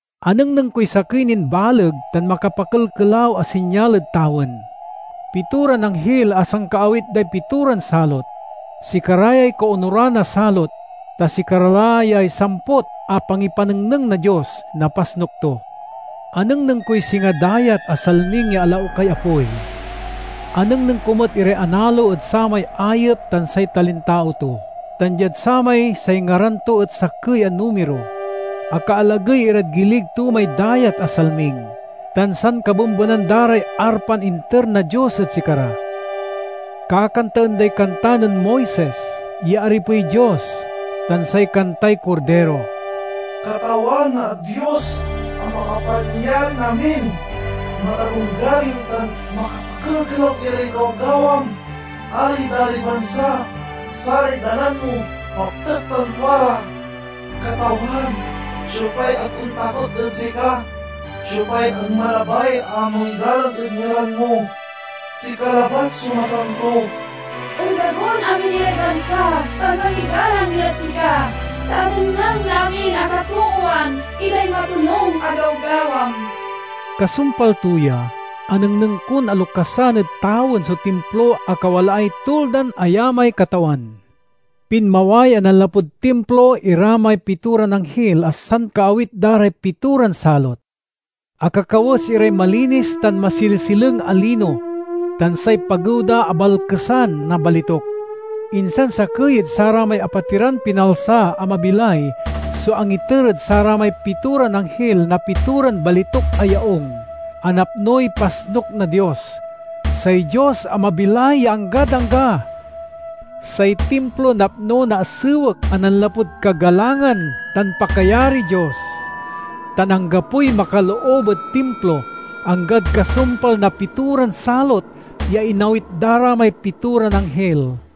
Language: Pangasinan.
Anengneng koy sakey nin baleg tan makapakelkelaw a sinyal ed tawen: pitoran anghil a sankaawit day pitoran salot. Sikara yay kaonuran a salot, ta sikara la yay samput a pangipanengneng na Dios na pasnuk to. Anengneng koy singa dayat a salming ya alaukay apoy. Anengneng ko met iray analo ed samay ayep tan say talintao to, tan diad samay say ngaran to et sakey a numiro. Akaalagey irad gilig to may dayat a salming, tan sankabembenan da ray arpan inter na Dios ed sikara. Kakantaen day kanta nen Moises, ya aripey Dios, tan say kantay Kordiro: "Katawan a Dios a Makapanyarin-amin matalonggaring tan makapakel-kelaw iray gawgawam! Ari da ray bansa, saray dalan mo maptek tan tua ra! Katawan, siopay ag ontakot ed sika? Siopay ag malabay a mangigalang ed ngaran mo? Sika labat so masanto. Ondagon amin iray bansa tan mangigalang irad sika, ta anengneng na amin a katoowan iray matonung a gawgawam." Kasumpal to ya, anengneng kon alokasan ed tawen so timplo a kawalaay Tuldan Ayamay Katawan. Pinmaway a nanlapud timplo ira may pitoran anghil a sankaawit da ray pitoran salot. Akakawes iray malinis tan masilesileng a lino, tan say pagew da abalkesan na balituk. Insan sakey ed saramay apatiran pinalsa a mabilay so angiter ed saramay pitoran anghil na pitoran balituk a yaung, a napnoy pasnuk na Dios, say Dios a mabilay ya anggad angga. Say timplo napno na asewek a nanlapud kagalangan tan pakayariy Dios, tan anggapoy makaloob ed timplo, anggad kasumpal na pitoran salot ya inawit da ra may pitoran anghil.